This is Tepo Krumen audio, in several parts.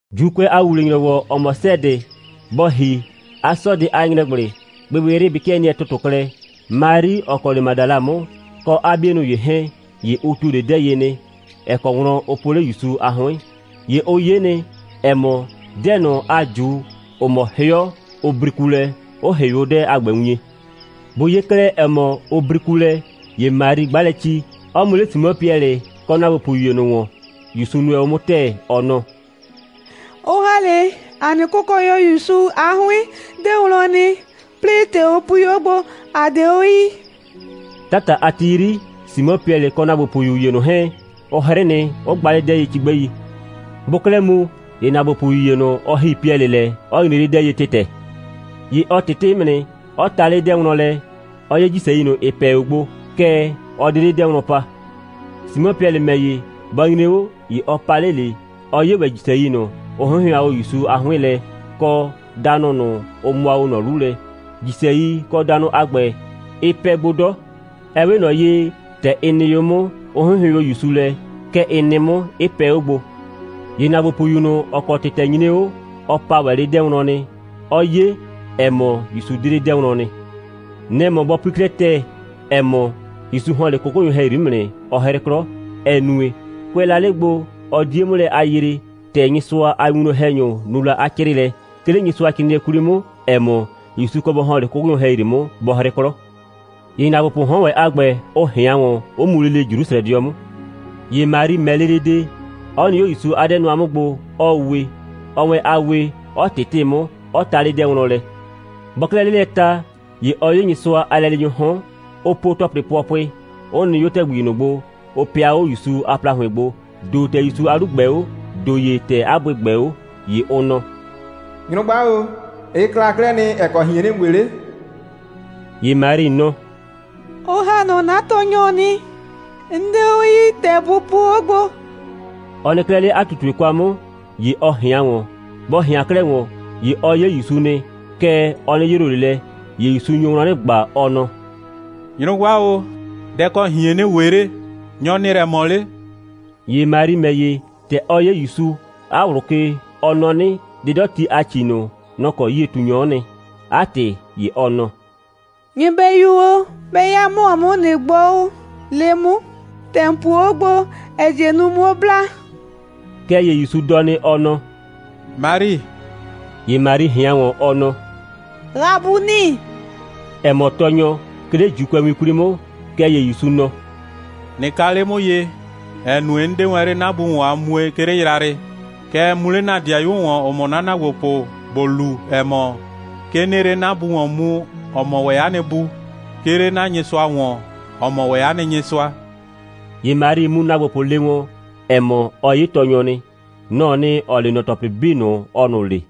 ‑Juukʋɛ a ‑wuwle‑nyrɔwɔ, ‑ɔ mɔ 'sɛɛdɩ, bɔ ‑hi, a 'sɔɔdɩ a ‑nyrɛgblɩ, gbɩgbɩyrɩ bɩ 'kɩɛ nɩɛ ‑tʋtʋ klɛ, Mari, ‑ɔ kɔ 'le Madala 'mʋ, kɔ 'a 'bienʋ ‑ye 'hɛɛn, ‑ye ʋ ‑tuo 'le 'dɛɛ ye nɩ, ‑ɛ kɔ wlɔn ʋ po 'le ‑Yusu a 'hʋɩn. ‑Ye ʋ 'ye nɩ, ‑ɛ mɔ, 'dɛɛ ꞊nʋ a ꞊ju, ‑ʋ mɔ 'hɩɔ, ʋ briku lɛ, 'ʋ ‑hɩʋ 'o 'dɛɛ a ‑gbɛ wien. Bʋ 'ye 'klɛɛ, ‑ɛ mɔ, ʋ briku lɛ, ‑ye Mari 'gba lɛ ci, 'ɔ mu 'le Simɔ Piɛlɩ kɔ ‑naagbopʋyu ‑ye ꞊nʋ ‑wɔn, ‑Yusu nʋɛ 'mʋ ‑tɛɛ, ɔ nɔ: «Ʋ ‑ha 'le ‑a nɩ Kʋkɔnyɔ ‑Yusu a 'hʋɩn 'dɛɛ wlɔn nɩ, 'plɩɩ ‑tɛ ʋ pui 'o gbo, ‑a 'de 'o yii.» 'Tata a ti 'yri, Simɔ Piɛlɩ kɔ ‑naagbopʋyu ‑ye ꞊nʋ 'hɛɛn, ʋ 'hrɩ nɩ, 'ʋ gba 'le 'dɛɛ ye cigbɛi. Bʋʋ 'klɛɛ mu, ‑ye ‑naagbopʋyu ‑ye ꞊nʋ, ɔ ‑hi Piɛlɩ lɛ, 'ɔ nyre 'le 'dɛɛ ye ‑tɩtɛ. ‑Ye ɔ ꞊tɩtɩ 'mʋ nɩ, 'ɔ ta 'le 'dɛɛ wlɔn lɛ, 'ɔ 'ye ‑jisɛi ꞊nʋ, ‑ɩ pɛ 'o gbo, kɛɛ, ɔ 'de 'le 'dɛɛ wlɔn pa. Simɔ Piɛlɩ ‑mɛ ‑ye, bɔ nyre 'o, ‑ye ɔ pa 'le ꞊le, 'ɔ 'ye ‑wɛ ‑jisɛi ꞊nʋ, ʋ 'hɩnhɩʋan ‑Yusu a 'hʋɩn lɛ, kɔ danʋ ꞊nʋ, ʋ mʋa ꞊nɔ 'lu lɛ. ‑Jisɛi kɔ danʋ a ‑gbɛ, ɩ pɛ gbo 'dɔ. Ɛ 'we ꞊nɔ ye, ‑tɛ ɩ nɩ o 'mʋ, 'ʋ 'hɩnhɩʋɩn o ‑Yusu lɛ, kɛ ɩ nɩ 'mʋ, 'ɩ pɛ 'o gbo. ‑Ye ‑naagbopʋyu ꞊nʋ, ‑ɔ kɔ ‑tɩtɛ nyre 'o, ɔ pa ‑wɛ 'le 'dɛɛ wlɔn nɩ, 'ɔ 'ye, ‑ɛ mɔ, ‑Yusu 'de 'le 'dɛɛ wlɔn nɩ. Nɛ‑ mɔ bɔ pui 'klɛɛ ‑tɛɛ, ‑ɛ mɔ, ‑Yusu ‑hɔn 'le 'kʋkʋnyʋ ‑hɛyri 'mʋ nɩ, 'ɔ 'hrɩ 'klɔ, ‑ɛ nue, kʋɛ la 'le gbo, ʋ 'die 'mʋ lɛ a yree, ‑tɛ Nyɩsʋa a winwlɔn‑hɛnyʋ nu la 'a 'crɩɩlɛ, 'ke 'le Nyɩsʋacrɩɩnɩɛ 'kwli 'mʋ, ‑ɛ mɔ, ‑Yusu kɔ bɔ ‑hɔn 'le 'kʋkʋnyʋ ‑hɛyri 'mʋ, bɔ 'hrɩ 'klɔ. ‑Ye ‑naagbopʋʋ 'hɔn ‑wɛ a ‑gbɛ, ʋ ꞊hɩan ‑wɔn, 'ʋ mu lele Jrusrɛdɩɔ 'mʋ. ‑Ye Mari ‑mɛ lele de, 'ɔ nɩ 'o ‑Yusu a 'dɛɛ nʋa 'mʋ gbo, 'ɔɔ we. Ɔɔ wɛn a wee, 'ɔ ꞊tɩtɩ 'mʋ, 'ɔ ta 'le 'dɛɛ wlɔn lɛ. Bɔɔ 'klɛɛ 'le lɛ ta, ‑ye ɔ 'ye 'le Nyɩsʋa a lɛleenyʋʋ 'hɔn, 'ʋ po ‑tɔplɩ pʋɔpʋɩ, 'ʋ nɩ 'o ‑tɛgbi ꞊nʋ gbo, ʋ pɩa 'o ‑Yusu a ‑plahʋɩn gbo, ‑do ‑tɛ ‑Yusu a 'lu ꞊gbɛɛ 'o, ‑do ‑ye ‑tɛ 'a bʋɩ ꞊gbɛɛ 'o. ‑Ye ʋ nɔ: «Nyrʋgba o, ɩ kla 'klɛɛ nɩ, ‑ɛ kɔ ꞊hien ‑nɩɩ we 'le?» ‑Ye Mari nɔ: «Ʋ ‑ha nɔ 'na Tɔɔnyɔ nɩ. 'N 'de 'o yii, ‑tɛ bʋ puo 'o gbo.» Ɔ nɩ 'klɛɛ 'le 'a ꞊tutue kwa 'mʋ, ‑ye ɔ ꞊hɩan ‑wɔn. Bɔ ꞊hɩan 'klɛɛ ‑wɔn, ‑ye ɔ 'ye ‑Yusu nɩ, kɛɛ, ɔ 'nɩ yroo ꞊le lɛ. ‑Ye ‑Yusu nyo wlɔn 'nɩ ꞊gba, ɔ nɔ: «Nyrʋgba o, dɛ‑ kɔ ꞊hien ‑nɩɩ we 'le? Nyɔ‑ ‑nɩɩ lɛ ꞊mɔ 'le?» ‑Ye Mari ‑mɛ ‑ye, ‑tɛ ɔ 'ye ‑Yusu, 'a ꞊wlʋ ke, ɔ nɔ 'nɩ, 'dɩdɔti a ‑ci ꞊nʋ, nɔ‑ kɔ 'yie꞊tunyɔ'ɔ nɩ. 'A ‑tɩ, ‑ye ɔ nɔ: «Nyɩbɛyu o, 'bɛ 'ya ‑mɔ 'mʋ o, ꞊nɩ gbɔ, le 'mʋ, ‑tɛ ‑n puo 'o gbo, ‑ɛ die nu, 'muo bla.» Kɛɛ ‑ye ‑Yusu dɔ nɩ, ɔ nɔ: «Mari!» ‑Ye Mari ꞊hɩan ‑wɔn, ɔ nɔ: «Rabuni,» ‑ɛ mɔ Tɔɔnyɔ, 'ke 'le ‑Juukʋɛwin 'kwli 'mʋ. Kɛɛ ‑ye ‑Yusu nɔ: «꞊Nɩ ka 'le 'mʋ ye, ‑ɛ nue, 'n 'de wɛn 'le 'na Bu ‑wɔn a mue, 'ke 'le yrayrɩ. Kɛɛ, mu 'le 'na ‑dɩayuo ‑wɔn, ‑ʋ mɔ 'na ‑naagbopʋ, ‑bo lu, ‑ɛ mɔ, 'ke 'nɩɩ 'le 'na Bu ‑wɔn mu, ‑ɔ mɔ ‑wɛ 'a nɩ Bu, 'ke 'le 'na Nyɩsʋa ‑wɔn, ‑ɔ mɔ ‑wɛ 'a nɩ Nyɩsʋa.» ‑Ye Mari mu ‑naagbopʋ le wɔn, ‑ɛ mɔ, ɔ 'ye Tɔɔnyɔ nɩ. Nɔ‑ɔ nɩ, ‑ɔ le ꞊nɔ ‑tɔplɩ 'bii ꞊nʋ, ɔɔ ꞊nʋ le.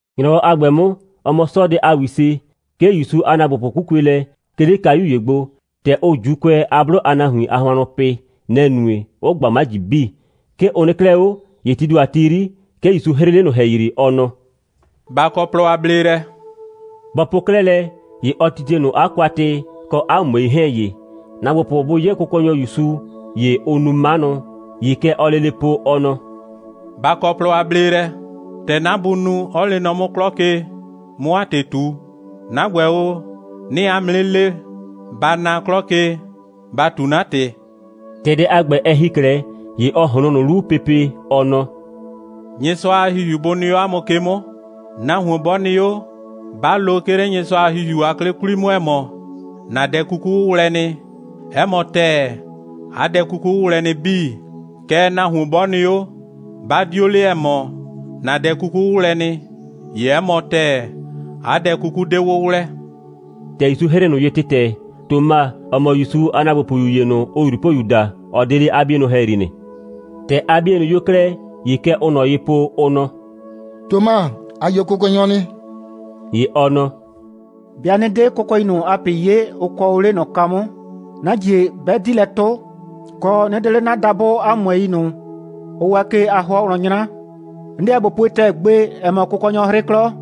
‑Nyrɔwɔ a ‑gbɛ 'mʋ, ‑ɔ mɔ 'sɔɔdɩ a ‑wise, 'ke ‑Yusu a ‑naagbopʋ 'kukue lɛ, 'ke 'le kayu ‑ye gbo. ‑Tɛ ʋʋ ‑Juukʋɛ a 'blʋ a nahuin a hʋannʋ pɩ, nɛ‑ nue, 'ʋ ꞊gba 'maji 'bii. 'Ke ʋ nɩ 'klɛɛ 'o, ‑ye tii ‑do a ti 'yri, 'ke ‑Yusu 'hrɩɩ 'le ꞊nʋ ‑hɛyri, ɔ nɔ: «Ba kɔ plɔ a bleelɛ!» Bɔ po 'klɛɛ lɛ, ‑ye ɔ titie ꞊nʋ 'a kwatɩ kɔ 'a ꞊mʋɛi 'hɛɛn ye. ‑Naagbopʋ bʋ 'ye Kʋkɔnyɔ ‑Yusu, ‑ye ʋʋ nu 'manʋ. ‑Ye kɛ ɔɔ lele po, ɔ nɔ: «Ba kɔ plɔ a bleelɛ! ‑Tɛ 'na Bu nu, 'ɔ lee nɔ 'mʋ 'klɔ ke, 'mʋ 'a ‑tɩ ꞊tu, 'na ‑gbɛ o, 'nɩɩ 'a mʋ 'nɩ le, ba na 'klɔ ke, ba ꞊tu 'na ‑tɩ.» ‑Tɛ dɛ a ‑gbɛ, ɛ ‑hi 'klɛɛ, ‑ye ɔ ꞊hloon ꞊nʋ 'lu pepe, ɔ nɔ: «Nyɩsʋa a ‑Hihiu bʋ nɩ 'o 'a mʋ ke 'mʋ! Nahuon 'bɔ nɩ 'o, 'ba lo, 'ke 'le Nyɩsʋa a ‑Hihiu a 'klɩ 'kwli 'mʋ, ‑ɛ mɔ: ‑Na dɛ 'kuku 'wʋwlɛ nɩ, 'ɛ mɔ ‑tɛɛ, 'a dɛ 'kuku 'wʋwlɛ nɩ 'bii. Kɛɛ, nahuon 'bɔ nɩ 'o, 'ba 'dio le, ‑ɛ mɔ: ‑Na dɛ 'kuku 'wʋwlɛ nɩ, ‑ye 'ɛ mɔ ‑tɛɛ, 'a dɛ 'kuku 'de 'wʋwlɛ.» ‑Tɛ ‑Yusu 'hrɩɩ ꞊nʋ ye ‑tɩtɛ, Toma, ‑ɔ mɔ ‑Yusu a ‑naagbopʋyu ‑ye ꞊nʋ, ʋʋ ꞊Yrupoyu daa, ɔ 'de 'le 'a 'bienʋ ‑hɛyri nɩ. ‑Tɛ 'a 'bienʋ 'yo 'klɛɛ, ‑ye kɛ ʋʋ ꞊nɔ ye po, ʋ nɔ: «Toma, ‑a 'ye Kʋkɔnyɔ nɩ.» ‑Ye ɔ nɔ: «'Bɩa 'nɩ 'de kʋɛkʋɛi ꞊nʋ a ꞊pɩ 'ye, ʋ kɔɔ 'le ꞊nɔ kwa 'mʋ, 'na ‑jie 'bɛ 'di lɛ 'tʋ, kɔ, 'nɩ 'de 'le 'na dabʋ 'a ꞊mʋɛi ꞊nʋ, ʋ waa ke a 'hʋɔ wlɔn 'nyra, 'n 'deɛ ꞊bo pue ‑tɛɛ gbe, ‑ɛ mɔ, Kʋkɔnyɔ 'hrɩ 'klɔ.»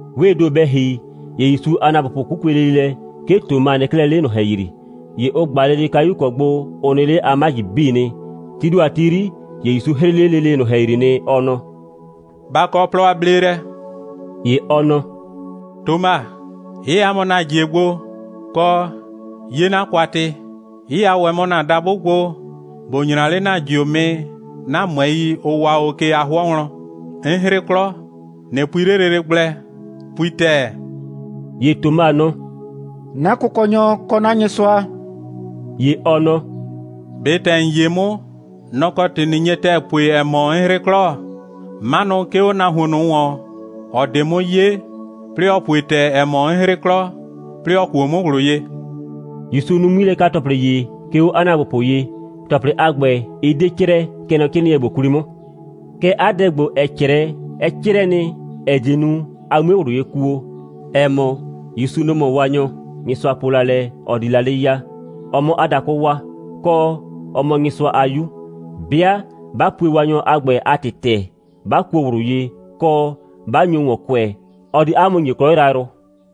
'Wee ‑do bɛ ‑hi, ‑ye ‑Yusu a ‑naagbopʋ 'kukue lele lɛ. 'Ke Toma nɩ 'klɛɛ 'le ꞊nʋ ‑hɛyri. ‑Ye ʋ ꞊gba lele kayu ‑kɔ gbo ʋ nɩ 'le a 'maji 'bii nɩ. Tii ‑do a ti 'yri, ‑ye ‑Yusu 'hrɩɩ 'le lele ꞊nʋ ‑hɛyri nɩ, ɔ nɔ: «Ba kɔ plɔ a bleelɛ!» ‑Ye ɔ nɔ: «Toma, 'yɩya mɔ ‑na ‑jie gbo, kɔ, 'ye 'na kwatɩ, 'yɩya ‑wɛ mɔ ‑na dabʋ gbo, ‑bo 'nyra 'le ‑na ‑jiomɩ 'na ꞊mʋɛi, ʋ waa o ke a 'hʋɔ wlɔn! 'N 'hrɩ 'klɔ, ꞊nɩ pui 'le lele gblɛ, pui ‑tɛɛ!» ‑Ye Toma nɔ: «'Na Kʋkɔnyɔ, kɔ 'na Nyɩsʋa.» ‑Ye ɔ nɔ: «꞊Be ‑tɛ ‑n 'ye 'mʋ, nɔ‑ kɔ ‑tɩ ꞊nɩ nye ‑tɛɛ pue, ‑ɛ mɔ, 'n 'hrɩ 'klɔ. 'Manʋ 'ke 'o nahuon ꞊nʋ ‑wɔn, ‑ɔ 'de 'mʋ 'ye, 'plɩɩ ‑ɔ pue ‑tɛɛ, ‑ɛ mɔ, 'n 'hrɩ 'klɔ, 'plɩɩ ‑ɔ kuo 'mʋ ꞊wlʋ ye.» ‑Yusu nu 'ŋmilɛka‑tɔplɩ ‑ye, 'ke 'o 'a ‑naagbopʋ ye. ‑Tɔplɩ a ‑gbɛ, ɩ 'de 'crɛɛ, kɛ nɔ 'crɩɩnɩɛ ‑gbo 'kwli 'mʋ. Kɛɛ, 'a dɛ ‑gbo, ‑ɛ 'crɛɛ, ɛ 'crɛɛ nɩ, ‑ɛ die nu, a 'mue ꞊wlʋ ye kuo, ‑ɛ mɔ, ‑Yusu, nɔ‑ mɔ Waanyɔ, Nyɩsʋa po la lɛ, ɔ di la 'le ya, ɔ 'mʋ 'a dakʋ waa, kɔ, 'ɔ mɔ Nyɩsʋa a 'Yu. 'Bɩa 'ba pue Waanyɔ a ‑gbɛ a ‑tɩ ‑tɛɛ, 'ba kuo ꞊wlʋ ye, kɔ, 'ba nyo ‑wɔn kʋɛ, ɔ di 'a mʋ ‑nye 'klɔ yrayrʋ.